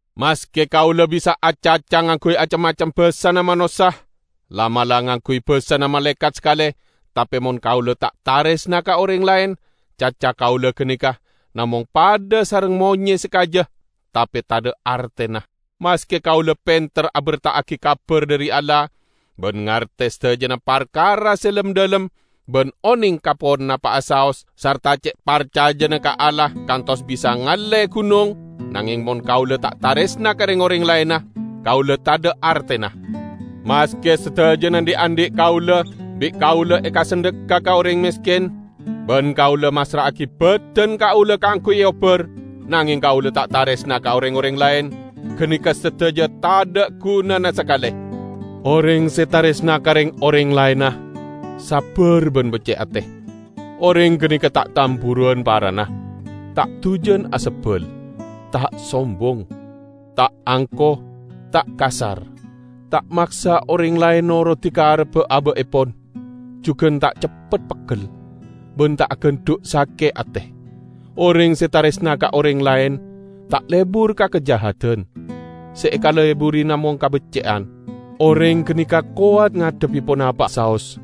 Maske kaula bisa acaca ngangguy acem-macem basana manossa, la'-mala' ngangguy basana malaekat sakale, tape mon kaula ta' taresna ka oreng laen, caca kaula ganeka namong padha sareng monye se kaja tape tadha' artena. Maske kaula penter aberta'agi kabar dhari Allah, ban ngarte sadajana parkara se lem-dhalem, ban oneng ka ponapa'a saos sarta ce' parcajana ka Allah kantos bisa ngalle gunong, nangeng mon kaula ta' taresna ka reng-oreng laenna, kaula tadha' artena. Maske sadajana dhi'-andhi' kaula bi' kaula ekasandhekka ka oreng mesken, ban kaula massra'agi badan kaula kaangguy eobbar, nangeng kaula ta' taresna ka reng-oreng laen, ganeka sadaja tadha' gunana sakale. Oreng se taresna ka reng-oreng laenna, sabbar ban becce' ate. Oreng ganeka ta' tamburuwan parana, ta' dujan asebbal, ta' sombong. Ta' angko, ta' kasar, ta' maksa oreng laen norodi karebba aba'epon, jugan ta' ceppet peggel, ban ta' agandhu' sake' ate. Oreng se taresna ka oreng laen ta' lebur ka kajahadan, se ekaleburi namong kabecce'an. Oreng ganeka kowat ngadhebbi ponapa'a saos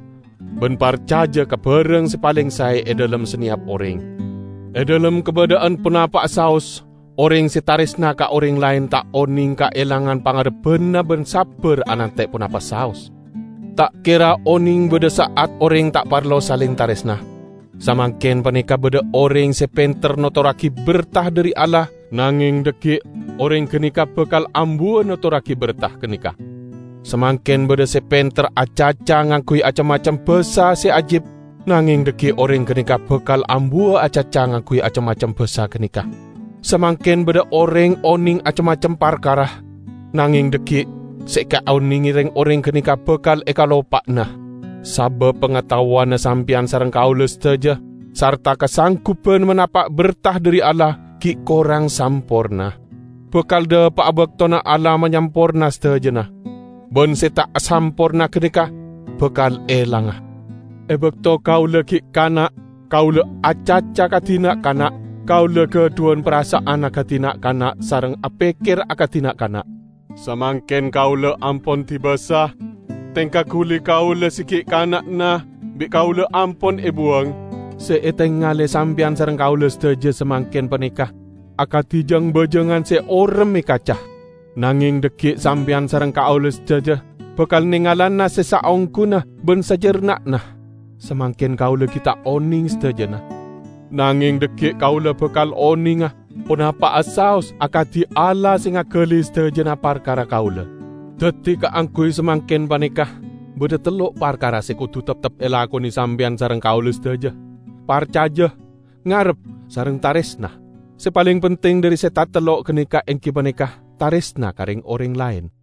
ban parcaja ka barang se paleng sae e dhalem saneyap oreng; e dhalem kabadha'an ponapa saos oreng se taresna ka oreng laen ta' oneng kaelangan pangarebbanna ban sabbar anante' ponapa saos. Ta' kera oneng badha sa'at oreng ta' parlo saleng taresna. Samangken paneka badha oreng se penter notorragi berta dhari Allah, nangeng dhaggi' oreng ganeka bakal ambuwa notorragi berta ganeka. Samangken badha se penter acaca ngangguy acem-macem basa se ajib, nangeng dhaggi' oreng ganeka bakal ambuwa acaca ngangguy acem-macem basa ganeka. Samangken badha oreng oneng acem-macem parkara, nangeng dhaggi' se ekaonenge reng-oreng ganeka bakal ekaloppa'ana. Sabab pangataowanna sampeyan sareng kaula sadaja sarta kasangguban manapa' berta dhari Allah, gi' korang samporna. Bakal dhapa'a baktona Allah manyamporna sadajana, ban se ta' samporna ganeka bakal elanga. E bakto kaula gi' kana', kaula acaca akadi na'-kana', kaula gadhuwan parasa'an akadi na'-kana' sareng apekker akadi na'-kana'. Samangken kaula ampon dibasa, tengka guli kaula se gi' kana'na bi' kaula ampon ebuwang. Se etengale sampeyan sareng kaula sadaja samangken paneka akadi jang-bajangan se orem e kaca. Nangeng dhaggi' sampeyan sareng kaula sadaja bakal nengalana se saongguna ban sajarna'na. Samangken kaula gi' ta' oneng sadajana, nangeng dhaggi' kaula bakal onenga ponapa'a saos akadi Allah se ngagali sadajana parkara kaula. Daddi, kaangguy samangken paneka badha tello' parkara se kodu teptep elakone sampeyan sareng kaula sadaja: parcaja, ngarep sareng taresna. Se paleng penting dhari se tatello' ganeka enggi paneka taresna ka reng-oreng laen.